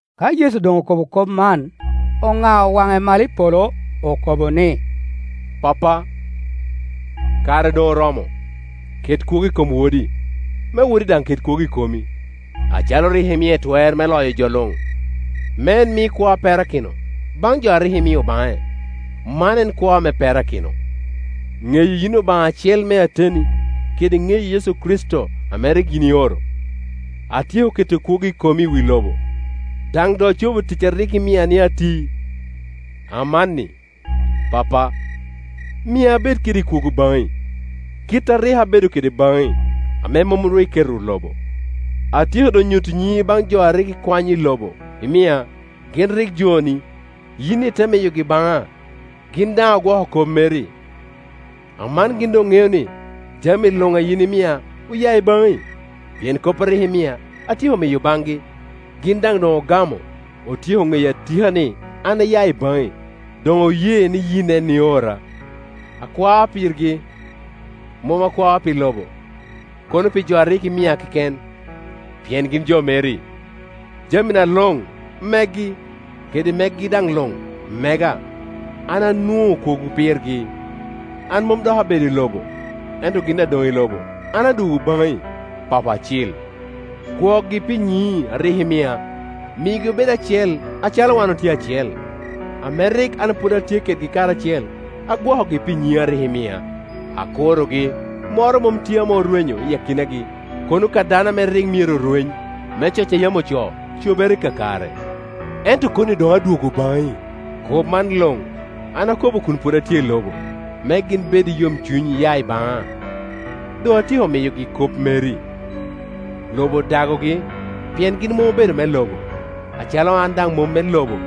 Ka Yecu doŋ okobo kop man, onao waŋe malo i polo, okobo ni, “Pappa, kare doŋ oromo, ket kwogo i kom Wodi, me Wodi daŋ ket kwogo i komi, acalo rik imie twer me loyo jo luŋ, me en mi kwo a perakino baŋ jo a rik imio baŋe. Man en kwo ame perakino: ŋeyi yin Obaŋa acel me ateni, kede ŋeyo Yecu Kricito ame rik yin ioro. Atyeko keto kwogo i komi i wi lobo, daŋ doŋ acobo tic a rik imia ni ati. Amanni, Pappa, mia abed kede kwogo baŋi, kit a rik abedo kede baŋi ame mom ru iketo lobo. “Atyeko doŋ nyuto nyiŋi baŋ jo a rik ikwanyo i lobo, imia. Gin rik joni, yini ite miyogi baŋa, gin daŋ ogwoko kop mer i. Aman gin doŋ ŋeo ni jami luŋ a yin imia oya i baŋi; pien kop a rik imia, atyeko miyo baŋgi, gin daŋ doŋ ogamo, otyeko ŋeyo atika ni an aya i baŋi, doŋ oye ni yin en iora. Akwao pirgi, mom akwao pi lobo, kono pi jo a rik imia keken, pien gin jo meri. Jamina luŋ megi, kede megi daŋ luŋ mega, an anwoŋo kwogo pirgi. An mom dok abedo i lobo, ento gin adoŋ i lobo, an adwogo baŋi. Papo Acil, gwokgi pi nyiŋi a rik imia, migi obed acel, acalo wan otye acel. Ame rik an pwod atye kedgi karacel, agwokogi pi nyiŋi a rik imia. Akurogi, moro mom tye ame orwenyo i akinagi, kono ka dano ame rik myero rweny, me coc a yam ocoo cobere kakare. Ento koni doŋ adwogo baŋi. Kop man luŋ an akobo kun pwod atye i lobo, me gin bed i yomcuny aya i baŋa. Doŋ atyeko miyogi kop meri. Lobo odagogi, pien gin mom obedo jo me lobo, acalo an daŋ mom me lobo.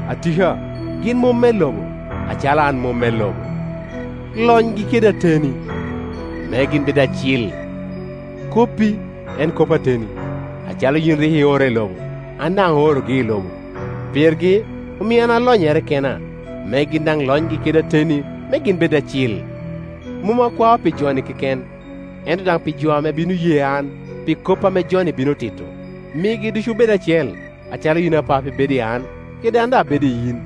Atika, gin mom me lobo, acalo an mom me lobo. Lonygi kede ateni, me gin bed acil. Koppi en kop ateni. Acalo yin rik iora i lobo, an daŋ aorogi i lobo. Pirgi omio an alonyere kena, me gin daŋ lonygi kede ateni, me gin bed acil. “Mom akwao pi jo-ni keken, ento daŋ pi jo ame bino ye an pi kop ame jo-ni bino tito. Migi ducu obed acel, acalo yin. Apap, ibedo i an kede an daŋ abedo i yin.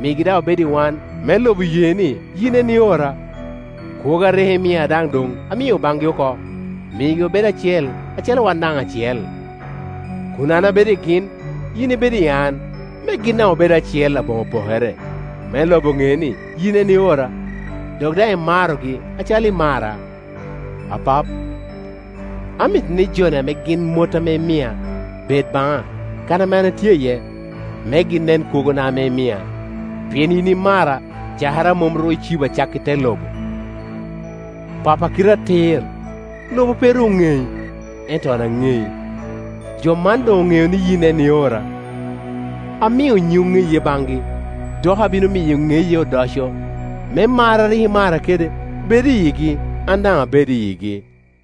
Migi daŋ obed i wan, me lobo ye ni yin en iora. Kwogo a rik imia daŋ doŋ amio baŋgi oko. Migi obed acel, acalo wan daŋ acel, kun an abedo i gin, yin ibedo i an, me gin daŋ obed acel aboŋo pokere, me lobo ne ni yin en iora, dok daŋ imarogi acalo imara. “Apap, amito ni jo-ni ame gin mot ame imia, bed baŋa, kan ame atye iye, me gin nen kwogona ame imia, pien yin imara cakere a mom ru icibo acakki te lobo. Pa po a kite atir, lobo pe ru oŋei, ento an anei, jo man doŋ oŋeo ni yin en iora. Amio nyiŋi oŋeye baŋgi, dok abino miyo ŋeye odoco, me mar a rik imara kede bed i yigi, an daŋ abed i yigi.”